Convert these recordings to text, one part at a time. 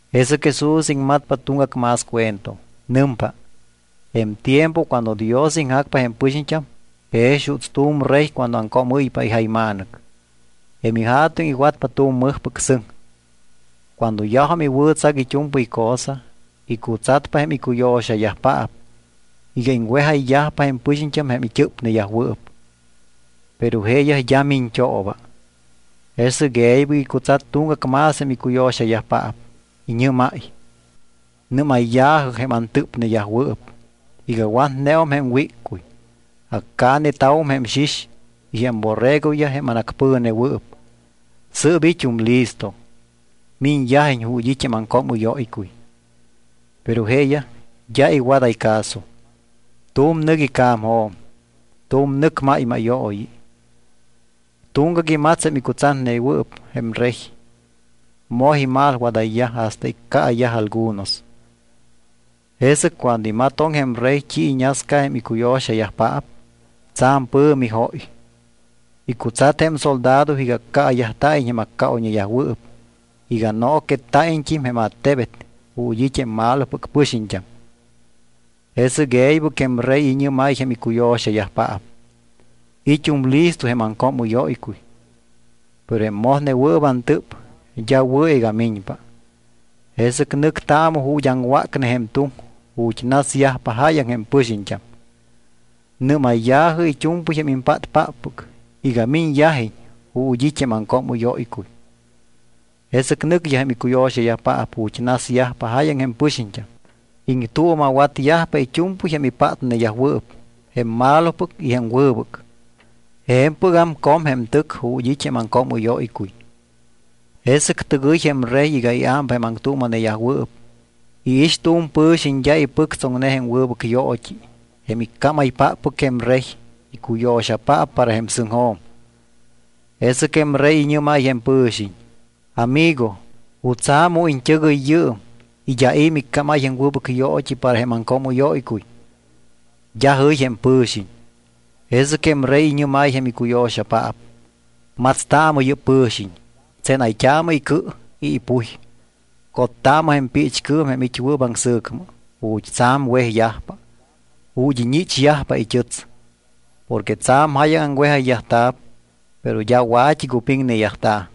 Jesɨc Jesús iŋmatpa tuŋgac más cuento. Nɨmpa: —Jém tiempo cuando Dios iŋjacpa jém pɨxiñt́am jex juuts tu̱m rey cuando aŋcoomɨ́ypa ijayma̱nɨc. Jém ija̱tuŋ iwatpa tu̱m mɨjpɨc sɨŋ. Cuando yajum iwɨ̱tsac it́u̱mpɨy cosa, icutsat jém icuyo̱xayajpaap iga iŋwejayyajpa jém pɨxiñt́am jém it́ɨ́pneyajwɨɨp. Pero jeeyaj d́a miñt́ooba. Jesɨc e̱ybɨc icutsat tuŋgac más jém icuyo̱xayajpaap. Iñɨ́máy: “Nɨ́mayya̱jɨ jém antɨ́pneyajwɨɨp iga watneum jém wíccuy. Accaaneta̱wum jém xix y jém borregoyaj jém anacpɨ̱newɨɨp. Sɨɨp it́um listo, miñyajiñ ju̱t́ it́ jém aŋcoomɨ́yóycuy.” ’Pero jeeyaj d́a iwadáy caso. Tu̱m nɨc ica̱mjo̱m, tu̱m nɨc máymáyooyi. Tuŋgac imats jém icutsatneyajwɨɨp jém rey, moj imalwadayyaj hasta iccaayaj algunos. Jesɨc cuando imatoŋ jém rey t́i iñasca jém icuyo̱xayajpaap, tsa̱m pɨ̱mi jóy. Icutsat jém soldado iga accaayajta̱iñ jém accaoyñeyajwɨɨp y iga nooquetta̱iñt́im jém attebet ju̱t́ it́ jém malopɨc pɨxiñt́am. Jesɨc e̱ybɨc jém rey iñɨ́máy jém icuyo̱xayajpaap: “It́um listo jém aŋcoomɨ́yóycuy, pero jém mojnewɨɨp antɨ́p d́a wɨ̱ iga miñpa. Jesɨc nɨctaamɨ ju̱t́ aŋwácne jém tuŋ ju̱t́ nasyajpa jáyaŋ jém pɨxiñt́am. Nɨ́mayya̱jɨ it́u̱mpɨy jém impátpáppɨc iga miñyajiñ ju̱t́ it́ jém aŋcoomɨ́yóycuy.” Jesɨc nɨcyaj jém icuyo̱xayajpaap ju̱t́ nasyajpa jáyaŋ jém pɨxiñt́am. Iŋtuuma̱watyajpa it́u̱mpɨy jém ipátneyajwɨɨp, jém malopɨc y jém wɨbɨc. Je̱mpɨgam com jém tɨc ju̱t́ it́ jém aŋcoomɨ́yóycuy. ’Jesɨc tɨgɨy jém rey iga iámpa jém aŋtuuma̱neyajwɨɨp. Iix tu̱m pɨ̱xiñ d́a ipɨctsoŋne jém wɨbɨc yoot́i jém iccámaypáppɨc jém rey icuyo̱xapaap para jém sɨŋjo̱m. Jesɨc jém rey iñɨ́máy jém pɨ̱xiñ: “Amigo, ¿jutsa̱ mu iñt́ɨgɨy yɨɨm y d́a i̱ miccámáy jém wɨbɨc yoot́i para jém aŋcoomɨ́yóycuy?” D́a jɨy jém pɨ̱xiñ. Jesɨc jém rey iñɨ́máy jém icuyo̱xapaap: “Matstaamɨ yɨ́p pɨ̱xiñ, tsénayt́aamɨ icɨ y ipuy. Cottaamɨ jém piichcɨɨm jém it́wɨɨp aŋsɨ̱cmɨ, ju̱t́ tsa̱m wejyajpa, ju̱t́ iñichyajpa it́ɨts.” Porque tsa̱m jáyaŋ aŋwejayyajta̱p, pero d́a wa̱t́i cupiŋneyajta̱.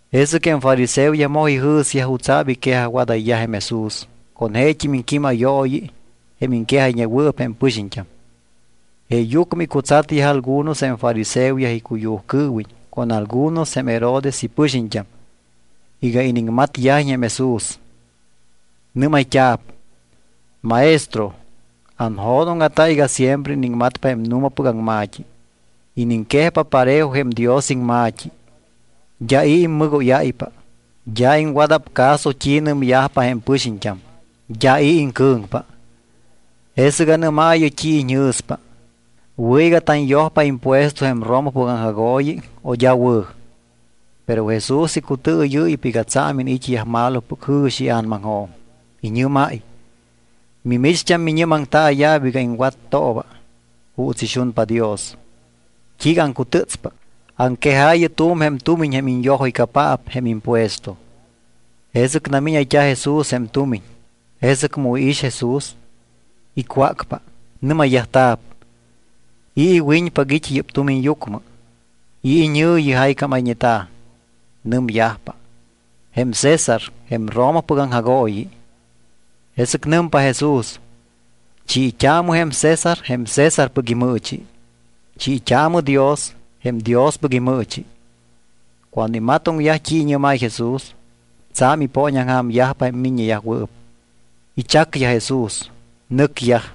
Jesɨc jém fariseoyaj moj ijɨ̱syaj jutsa̱p iquejajwadáy jém Jesús con jeet́im iŋquímayooyi jém iŋquejayñewɨɨp jém pɨxiñt́am. Jeeyucmɨ icutsatyaj algunos jém fariseoyaj icuyujcɨɨwiñ con algunos jém Herodes ipɨxiñt́am iga iniŋmatyajiñ jém Jesús. Nɨ́mayt́a̱p: —Maestro, anjo̱dóŋa̱ta iga siempre iniŋmatpa jém nu̱mapɨc aŋma̱t́i. Iniŋquejpa parejo jém Dios iŋma̱t́i, d́a i̱ immɨgóyáypa. D́a iŋwada̱p caso t́i nɨmyajpa jém pɨxiñt́am. D́a i̱ iŋcɨ̱ŋpa. Jesɨc anɨ́maayɨ t́i iñjɨ̱spa: ¿Wɨ̱ iga tanyojpa impuesto jém Romapɨc aŋjagooyi o d́a wɨ̱? Pero Jesús icutɨɨyɨ́ypa iga tsa̱m iniit́yaj malopɨc jɨ̱xi ia̱namaŋjo̱m. Iñɨ́máy: —Mimicht́am miñɨ́maŋtaaya̱p iga iŋwattooba juuts ixunpa Dios. ¿T́iiga aŋcutɨ́tspa? Aŋquejaayɨ tu̱m jém tumiñ jém iñyojóycapaap jém impuesto. Jesɨc namíñayt́a̱ Jesús jém tumiñ. Jesɨc mu iix Jesús, icwácpa. Nɨ́mayyajta̱p: —¿I̱ iwiñpac it́ yɨ́p tumiñyucmɨ? ¿I̱ iñɨ̱yi jaycámayñeta̱? Nɨmyajpa: —Jém César jém Romapɨc aŋjagooyi. Jesɨc nɨmpa Jesús: —Chiit́aamɨ jém César jém Césarpɨc imɨɨchi. Chiit́aamɨ Dios jém Diospɨc imɨɨchi. Cuando imatoŋyaj t́i iñɨ́máy Jesús, tsa̱m ipooñaŋja̱myajpa jém miññeyajwɨɨp. Ichacyaj Jesús, nɨcyaj.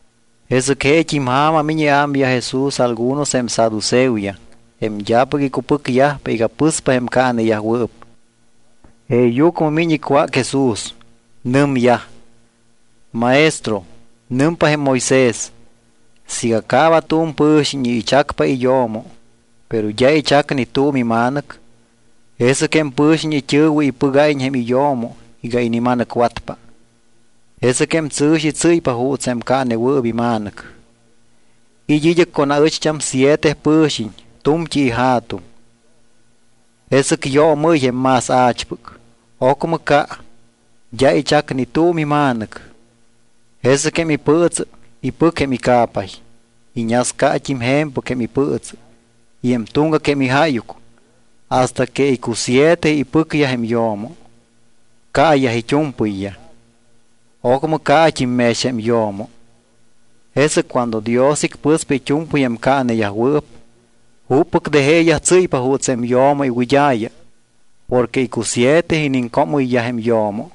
Jesɨc jeet́im ja̱ma miñ iámyaj Jesús algunos jém saduceoyaj, jém d́apɨc icupɨcyajpa iga pɨspa jém caaneyajwɨɨp. Jeeyucmɨ miñ icwác Jesús. Nɨmyaj: —Maestro, nɨmpa jém Moisés, siiga caaba tu̱m pɨ̱xiñ y ichacpa iyo̱mo, pero d́a ichac ni tu̱m ima̱nɨc, jesɨc jém pɨ̱xiñ it́ɨ̱wɨ ipɨgáyiñ jém iyo̱mo iga inima̱nɨcwatpa. Jesɨc jém tsɨ̱xi tsɨ́ypa juuts jém caanewɨɨp ima̱nɨc. It́ id́ɨc con aɨcht́am siete pɨ̱xiñ tu̱mt́i ija̱tuŋ. Jesɨc yoomɨ́y jém más a̱chpɨc. Ocmɨ ca. D́a ichac ni tu̱m ima̱nɨc. Jesɨc jém ipɨɨtsɨ ipɨc jém ica̱pay. Iñascat́im je̱mpɨc jém ipɨɨtsɨ y jém tuŋgac jém ijáyuc hasta que icusiete ipɨcyaj jém yo̱mo. Caayaj it́u̱mpɨyyaj. Ocmɨ caat́im mex jém yo̱mo. Jesɨc cuando Dios icpɨspa it́u̱mpɨy jém caaneyajwɨɨp, ¿juppɨc de jeeyaj tsɨ́ypa juuts jém yo̱mo iwɨd́a̱ya? Porque icusiete iniŋcoomɨyyaj jém yo̱mo.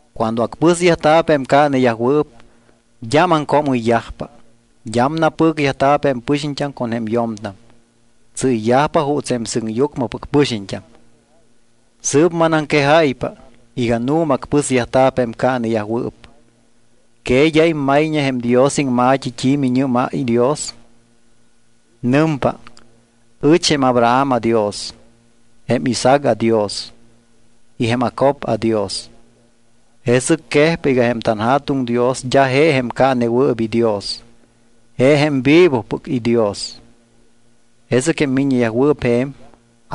Cuando acpɨsyajta̱p jém caaneyajwɨɨp, d́am aŋcoomɨyyajpa, d́am napɨcyajta̱p jém pɨxiñt́am con jém yo̱mtam. Tsɨ́yyajpa juuts jém sɨŋyucmɨpɨc pɨxiñt́am. Sɨɨp manaŋquejáypa iga nu̱ma acpɨsyajta̱p jém caaneyajwɨɨp. ¿Que d́a immayñe jém Dios iŋma̱t́i t́i miñɨ́máy Dios? Nɨmpa: “Ɨch jém Abraham aDios, jém Isaac aDios y jém Jacob aDios.” Jesɨc quejpa iga jém tanJa̱tuŋ Dios d́a je jém caanewɨɨp iDios, je jém vivopɨc iDios. Jesɨc jém miññeyajwɨɨp je̱m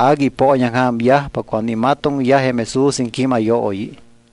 agui ipooñaŋja̱myajpa cuando imatoŋyaj jém Jesús iŋquímayooyi.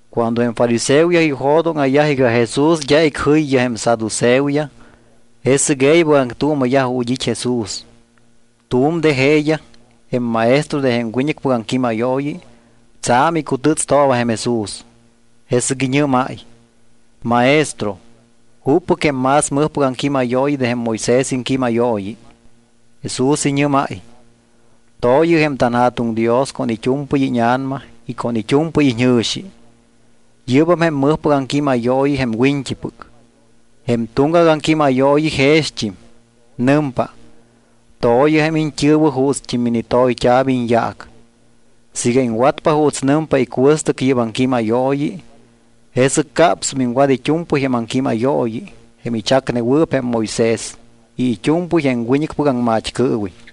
Cuando jém fariseoyaj ijo̱dóŋa̱yaj iga Jesús d́a icjɨyyaj jém saduceoyaj, jesɨc e̱ybɨc aŋtuuma̱yaj ju̱t́ it́ Jesús. Tu̱m de jeeyaj, jém maestro de jém wiñɨcpɨc aŋquímayooyi, tsa̱m icutɨ́tstooba jém Jesús. Jesɨc iñɨ́máy: —Maestro, ¿juppɨc jém más mɨjpɨc aŋquímayooyi de jém Moisés iŋquímayooyi? Jesús iñɨ́máy: —“To̱yɨ jém tanJa̱tuŋ Dios con it́u̱mpɨy íña̱nama y con it́u̱mpɨy iñjɨ̱xi.” Yɨ́bam jém mɨjpɨc aŋquímayooyi jém wiñt́ipɨc. Jém tuŋgac aŋquímayooyi jext́im. Nɨmpa: “To̱yɨ jém iñt́ɨ̱wɨ juuts minitoyt́a̱p iñyaac.” Siiga iŋwatpa juuts nɨmpa icuɨstɨc yɨ́p aŋquímayooyi, jesɨc capsum iŋwat it́u̱mpɨy jém aŋquímayooyi jém ichacnewɨɨp jém Moisés y it́u̱mpɨy jém wiñɨcpɨc aŋmat́cɨɨwiñ.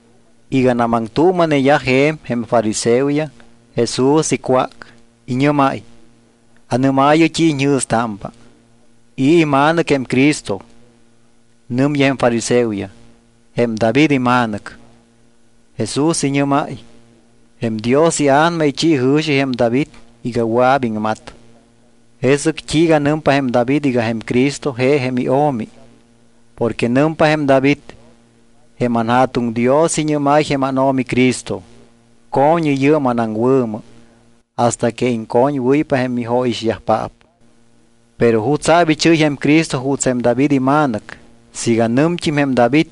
Iganam aŋtuuma̱neyaj je̱m jém fariseoyaj, Jesús icwác. Iñɨ́máy: —Anɨ́maayɨ t́i iñjɨ̱stámpa, ¿i̱ ima̱nɨc jém Cristo? Nɨmyaj jém fariseoyaj: —Jém David ima̱nɨc. Jesús iñɨ́máy: —Jém Dios iA̱nama ichi jɨ̱xi jém David iga wɨa̱p iŋmat, ¿jesɨc t́iiga nɨmpa jém David iga jém Cristo je jém iO̱mi? Porque nɨmpa jém David: Jém anJa̱tuŋ Dios iñɨ́máy jém ánO̱mi Cristo: “Co̱ñɨ yɨɨm anaŋwɨ̱mɨ hasta que iŋcoñwɨ́ypa jém mijóyixyajpaap.” ¿Pero jutsa̱p ichɨ́y jém Cristo juuts jém David ima̱nɨc, siiga nɨmt́im jém David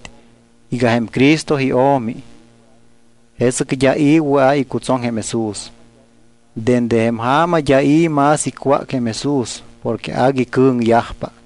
iga jém Cristo iO̱mi? Jesɨc d́a i̱ wɨa̱ icutsoŋ jém Jesús. Dende jém ja̱ma d́am i̱ más icwác jém Jesús porque agui cɨ̱ŋyajpa.